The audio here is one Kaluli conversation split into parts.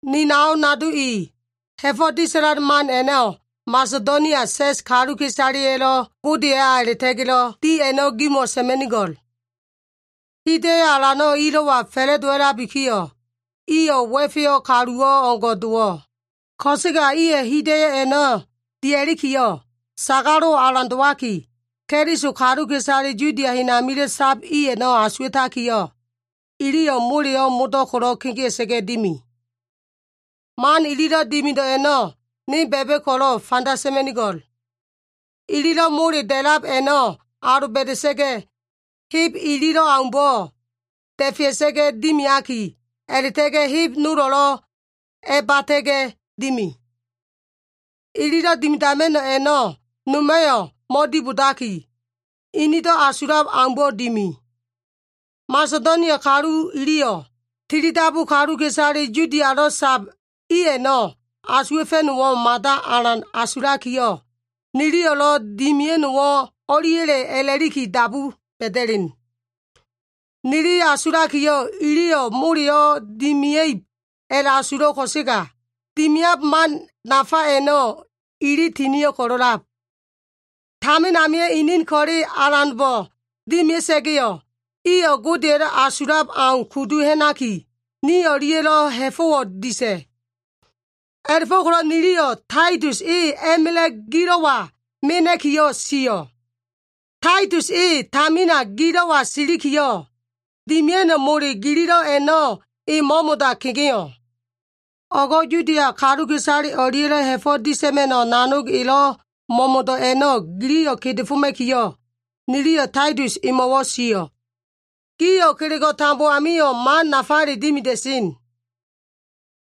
Ni nao nado i, ha꞉fo꞉ disa꞉lan man a꞉no꞉ Masedonia sa꞉s kaluka꞉isaleya꞉lo꞉ Godeya a꞉la꞉ta꞉ga꞉lo꞉ di a꞉no꞉ gimo꞉ sa꞉ma꞉nigo꞉l. Hida꞉yo꞉ alano꞉ ilo꞉wa fa꞉la꞉dowa꞉labikiyo꞉, iyo꞉ wa꞉feyo꞉ kaluwo꞉ o꞉ngo꞉ dowo꞉. Ko꞉sega iyo꞉ hida꞉yo꞉ a꞉no꞉ dia꞉likiyo꞉, sagalo꞉wo꞉ alan dowaki, Keliso kaluka꞉isale Yudia hen amilo꞉ sab i a꞉no꞉ asuwa꞉takiyo꞉, iliyo꞉ moleyo꞉ modo꞉ ko꞉lo꞉ kegea꞉sa꞉ga꞉ dimi. Man ililo꞉ dimido꞉ a꞉no꞉ ne ba꞉ba꞉ ko꞉lo꞉ fanda sa꞉ma꞉nigo꞉l. Ililo꞉ mole da꞉lab a꞉no꞉ aloba꞉da꞉sa꞉ga꞉, heb ililo꞉ aumbo꞉ da꞉fea꞉sa꞉ga꞉ dimiaki, a꞉la꞉ta꞉ga꞉ heb nolo꞉lo꞉ a꞉bata꞉ga꞉ dimi. Ililo꞉ dimidama꞉no꞉ a꞉no꞉ noma꞉yo꞉ mo꞉dibodaki, inido꞉ asulab aumbo꞉ dimi. Masedonia kalu iliyo꞉, tilidabu kaluka꞉isale Yudialo꞉ sab i a꞉no꞉ asuwa꞉fa꞉no꞉wo꞉ mada alan asulakiyo꞉, “Niliyo꞉lo꞉ dimia꞉no꞉wo꞉ o꞉liya꞉le” a꞉la꞉liki dabu ba꞉da꞉len. Nili asulakiyo꞉ iliyo꞉ moleyo꞉ dimia꞉ib a꞉la꞉asulo꞉ ko꞉sega, dimian man nafa a꞉no꞉ ili tinio꞉ ko꞉lo꞉lab. Tamin amio꞉ inin ko꞉le Alanbo꞉ dimia꞉sa꞉ga꞉yo꞉, iyo꞉ Godeya꞉lo꞉ asulab au kudu ha꞉naki, ni o꞉lia꞉yo꞉lo꞉ ha꞉fo꞉wo꞉ disa꞉. A꞉la꞉fo꞉ko꞉lo꞉ niliyo꞉ Taitus e a꞉ma꞉la꞉ gilo꞉wa mena꞉kiyo꞉ sio꞉. Taitus e tamina gilo꞉wa silikiyo꞉, dimia꞉no꞉ mole gililo꞉ a꞉no꞉ e mo꞉mo꞉da kegeo꞉. O꞉go꞉ Yudia kaluka꞉isale o꞉lia꞉lo꞉ ha꞉fo꞉ disa꞉ma꞉no꞉ nanog elo꞉ mo꞉mo꞉do꞉ a꞉no꞉ giliyo꞉ kedefoma꞉kiyo꞉, niliyo꞉ Taitus emo꞉wo꞉ sio꞉. Gio꞉ kelego꞉ tambo amio꞉ man nafale dimida꞉sen.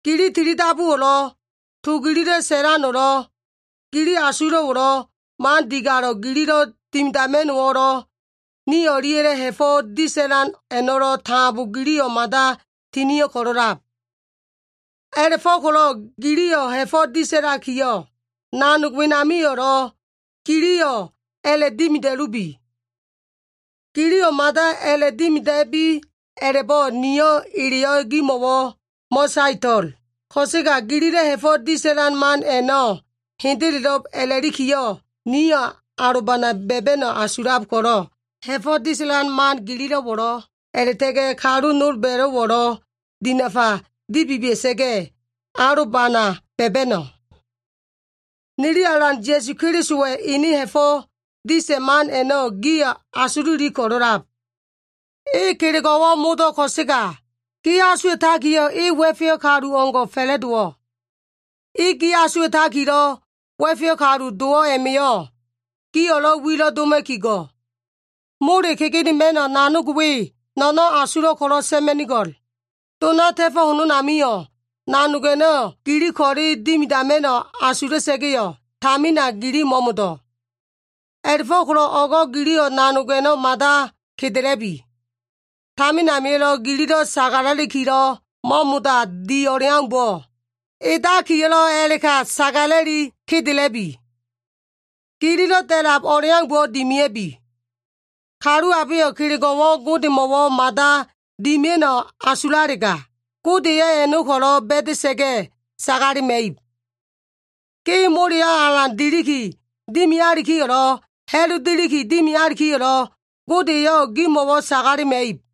Gili tilidabuwo꞉lo꞉, to gililo꞉ sa꞉lano꞉lo꞉, gili asulo꞉wo꞉lo꞉, man digalo꞉ gililo꞉ dimidama꞉no꞉wo꞉lo꞉, ni o꞉lia꞉lo꞉ ha꞉fo꞉ disa꞉lan a꞉no꞉lo꞉ tambo giliyo꞉ mada tinio꞉ ko꞉lo꞉lab. A꞉la꞉go꞉ko꞉lo꞉ gio꞉ ha꞉fo꞉ disa꞉lakiyo꞉, nanog wenamio꞉lo꞉ giliyo꞉ a꞉la꞉dimida꞉lubi. Giliyo꞉ mada a꞉la꞉dimida꞉bi a꞉la꞉bo꞉ niyo꞉ eleyo꞉ gimo꞉wo꞉ mo꞉saeto꞉l. Ko꞉sega gililo꞉ ha꞉fo꞉ disa꞉lan man a꞉no꞉ hendelo꞉b a꞉la꞉likiyo꞉, niyo꞉ alobana ba꞉ba꞉no꞉ asulab ko꞉lo꞉, ha꞉fo꞉ disa꞉lan man gililo꞉wo꞉lo꞉ a꞉la꞉ta꞉ga꞉ kalu nolba꞉lo꞉wo꞉lo꞉ dinafa dibibia꞉sa꞉ga꞉, alobana ba꞉ba꞉no꞉. Nili Alan Ya꞉su Kelisowa꞉ ene ha꞉fo꞉ disa꞉ man a꞉no꞉ gio꞉ asululi ko꞉lo꞉lab. E kelego꞉wo꞉ modo꞉ ko꞉sega, gi asuwa꞉takiyo꞉ e wa꞉feyo꞉ kalu o꞉ngo꞉ fa꞉la꞉dowo꞉. E gi asuwa꞉takilo꞉ wa꞉feyo꞉ kalu dowo꞉ a꞉ma꞉yo꞉, gio꞉lo꞉ wilo꞉ doma꞉ki go꞉. Mole kegenema꞉no꞉ nanogo꞉ we, no꞉no꞉n asulo꞉ ko꞉lo꞉ sa꞉ma꞉nigo꞉l. Dona ta꞉fo꞉ hononamio꞉, nanog a꞉no꞉ gili ko꞉le dimidama꞉no꞉ asula꞉sa꞉ga꞉yo꞉, tamina gili mo꞉mo꞉do꞉. A꞉la꞉fo꞉ko꞉lo꞉ o꞉go꞉ giliyo꞉ nanog a꞉no꞉ mada kedela꞉bi. Tamin amilo꞉ gililo꞉ sagala꞉likilo꞉ mo꞉mo꞉da di o꞉leaumbo꞉, edakiyo꞉lo꞉ a꞉la꞉ka sagala꞉li kedela꞉bi. Gililo꞉ da꞉lab o꞉leaumbo꞉ dimia꞉bi. Kalu abeyo꞉ kelego꞉wo꞉ Godemo꞉wo꞉ mada dimia꞉no꞉ asulalega, Gode eyo꞉ a꞉no꞉ ko꞉lo꞉ ba꞉da꞉sa꞉ga꞉ sagalema꞉ib. Ge moleyo꞉ alan deliki dimialikiyo꞉lo꞉, ha꞉lu deliki dimialikiyo꞉lo꞉, Gode eyo꞉ gemo꞉wo꞉ sagalema꞉ib.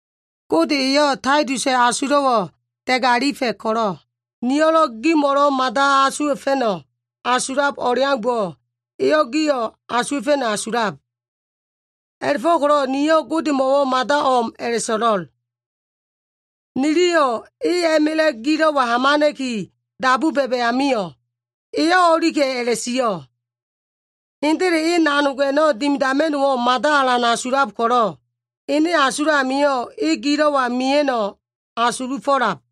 Gode eyo꞉ Taitusa꞉ asulo꞉wo꞉ da꞉galifa꞉ ko꞉lo꞉, nilo꞉ gimo꞉lo꞉ mada asuwa꞉fa꞉no꞉ asulab o꞉leaumbo꞉, eyo꞉ gio꞉ asuwa꞉fa꞉no꞉ asulab. A꞉la꞉fo꞉ko꞉lo꞉ niyo꞉ Godemo꞉wo꞉ mada o꞉m a꞉la꞉so꞉lo꞉l. Niliyo꞉ e a꞉ma꞉la꞉ gilo꞉wa hamana꞉ki dabu ba꞉ba꞉ amio꞉, eyo꞉ o꞉lika꞉ a꞉la꞉sio꞉. Hendele e nanog a꞉no꞉ dimidama꞉no꞉wo꞉ mada alan asulab ko꞉lo꞉, ene asulo꞉ amio꞉ e gilo꞉wa mia꞉no꞉ asulufo꞉lab.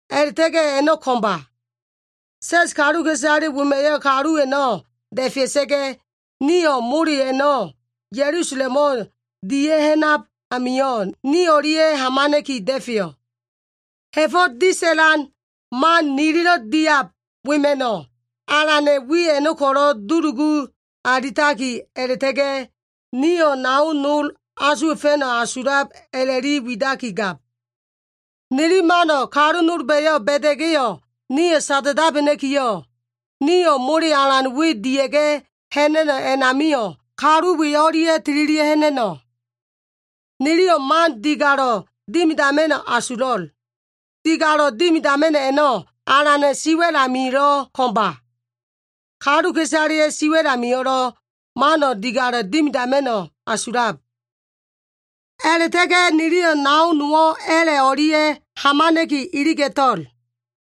A꞉la꞉ta꞉ga꞉ a꞉no꞉ ko꞉mba. Sa꞉s kaluka꞉isale wema꞉yo꞉ kalu a꞉no꞉ da꞉fea꞉sa꞉ga꞉, nio꞉ mole a꞉no꞉ Ya꞉lusalemo꞉ dia꞉ha꞉nab amio꞉ ni o꞉lia꞉ hamana꞉ki da꞉feyo꞉. Ha꞉fo꞉ disa꞉lan man nililo꞉ diab wema꞉no꞉, Alana꞉ wi a꞉no꞉ ko꞉lo꞉ dulugu alitaki a꞉la꞉ta꞉ga꞉, nio꞉ nao nolo꞉ asuwa꞉fa꞉no꞉ asulab a꞉la꞉li widakigab. Nili mano꞉ kalu nolba꞉yo꞉ ba꞉da꞉ga꞉yo꞉, nio꞉ sada꞉dabena꞉kiyo꞉, nio꞉ mole alan we dia꞉ga꞉ ha꞉na꞉no꞉ a꞉namio꞉, kalu we o꞉lia꞉ tililia꞉ ha꞉na꞉no꞉. Niliyo꞉ man digalo꞉ dimidama꞉no꞉ asulo꞉l. Digalo꞉ dimidama꞉no꞉ a꞉no꞉, Alana꞉ siwa꞉l amilo꞉ ko꞉mba. Kaluka꞉isaleya꞉ siwa꞉l amio꞉lo꞉ mano꞉ digalo꞉ dimidama꞉no꞉ asulab. A꞉la꞉ta꞉ga꞉ niliyo꞉ nao nowo꞉ a꞉la꞉ o꞉lia꞉ hamana꞉ki iliga꞉to꞉l.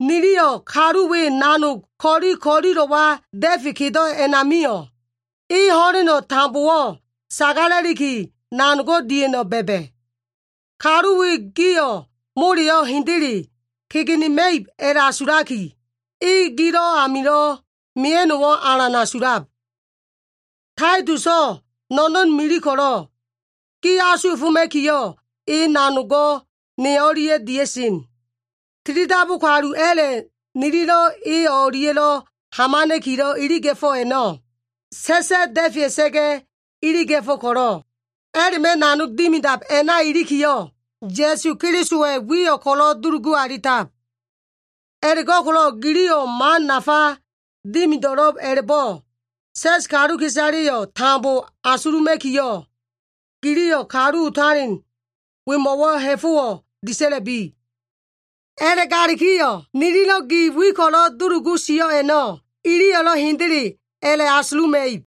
Niliyo꞉ kalu we nanog ko꞉li ko꞉lilo꞉wa da꞉fe kedo꞉ a꞉namio꞉, e ho꞉leno tambowo꞉ sagala꞉liki, nanogo꞉ dia꞉no꞉ ba꞉ba꞉. Kalu we gio꞉ moleyo꞉ hendele kegenema꞉ib a꞉la꞉asulaki, e gilo꞉ amilo꞉ mia꞉no꞉wo꞉ alan asulab. Taituso꞉ no꞉no꞉n mili ko꞉lo꞉, gi asuwa꞉foma꞉kiyo꞉, e nanogo꞉ ne o꞉lia꞉yo꞉ dia꞉sen. Tilidabu kalu a꞉la꞉ nililo꞉ e o꞉lia꞉lo꞉ hamana꞉kilo꞉ iliga꞉fo꞉ a꞉no꞉, sa꞉sa꞉ da꞉fea꞉sa꞉ga꞉ iliga꞉fo꞉ ko꞉lo꞉, a꞉la꞉ma꞉ nanog dimidab a꞉na ilikiyo꞉, Ya꞉su Kelisowa꞉ wiyo꞉ ko꞉lo꞉ dulugu alitab. A꞉la꞉go꞉ko꞉lo꞉ giliyo꞉ man nafa dimido꞉lo꞉b a꞉la꞉bo꞉, sa꞉s kaluka꞉isaleyo꞉ tambo asuluma꞉kiyo꞉, giliyo꞉ kalu otalen wemo꞉wo꞉ ha꞉fo꞉wo꞉ disa꞉la꞉bi. A꞉la꞉galikiyo꞉ nililo꞉ gi wi ko꞉lo꞉ dulugu sio꞉ a꞉no꞉, iliyo꞉lo꞉ hendelelo꞉b a꞉la꞉asuluma꞉ib.